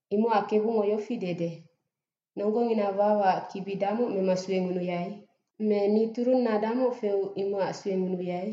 Imocac KEBUNGO yofi dede, “Nonggongina wawaac kibi damoc mema suengunuyai? Me ni turunna damoc feu imocac suengunuyai?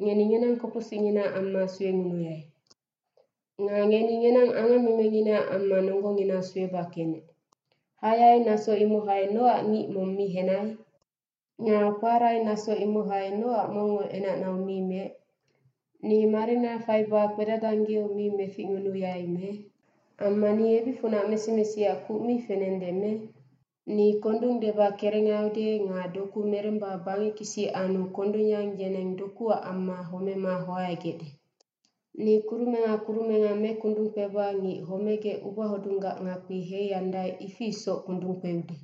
Ngeni ngenang koposicnginaac amma suengunuyai. Nga ngeni ngenang angammemenginaac amma nonggongina sueba kenec. Hayai naso imohai nocac ngic mong mi hennai? Nga kparai naso imohai nocac mongngo enacnau mi meec? Ni marina faiba kpedadanggeu mi meficngunuyai me? Amma ni ebicfunac mesimesiac kuc mi fenende me? Ni kondung deba kerengaiude nga doku meremba bangec kisi annu kondung yang yeneng dokuac amma homema hoaegecde. Ni kurumenga kurumenga mekundung kpeba ngic homegec ubahodunggac ngakpi heiandae ifi isoc kundung kpeude.”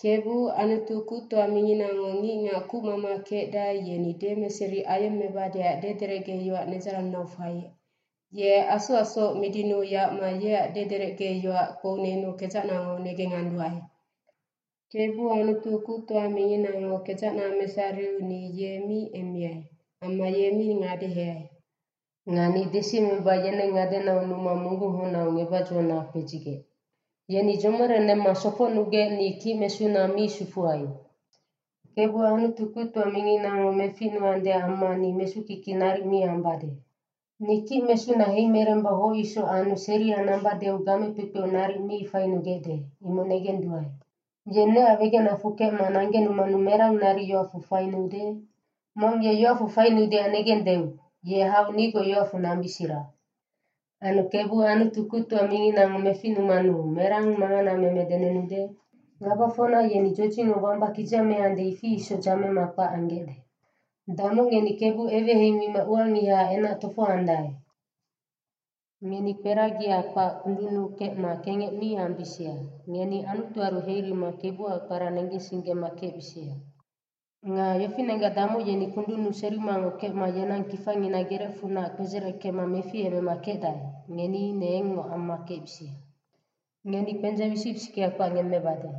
KEBU, Anutu kuctoa minginango ngicngac kucmama kecdae yeni demeseri ayemmebadeac dederecge yoac nedzarannau faiec, ye asoacsoc midinuu yacma yeac dederecge yoac kpounennu kedzacnango negenganduae. KEBU, Anutu kuctoa minginango kedzacna mesariu ni ye mi emmiai amma ye mi ngadeheai. Nga ni desiemeba yeneng ngadenau numa munggunghocnau ngebac dzona kpedzigec. Yeni dzomorenemma sofocnugec ni kicmesuna mi sufuai. KEBU, Anutu kuctoa minginango meficnuandeac amma ni mesukiki naric mi ambade. Ni kicmesuna heimeremba hoc isoc anu seria nambadeu game kpekpeu naric mi fainugecde, imoc negenduae. Ye neac wegenacfu kecma nanggenumanu merang naric yoacfu fainuude? Mong ye yoacfu fainuudeac negendeu, ye hau nigoc yoacfu nambisira. Anu KEBU, Anutu kuctoa minginango meficnumanu, merang manganameme denennude? Ngabafocna yeni dzodzicngo wamba kidzameande ifi isoc dzamema kpac anggecde. Damoc ngeni KEBU eweheimima uangihaac enac tofohoandae. Ngeni kperagia kpac kundunnu kecma kengec mi ambisia. Ngeni Anutuaru herima KEBUAC kpara negensinggema kecbisia. Nga yofinenggac damoc yeni kundunnu serimangoc kecma yenang kifangina gerecfunac kpedzereckema meficemema kecdae, ngeni ine engngoc amma kecbisia. Ngeni kpendzeng wisic wisickea kpac ngemmebade.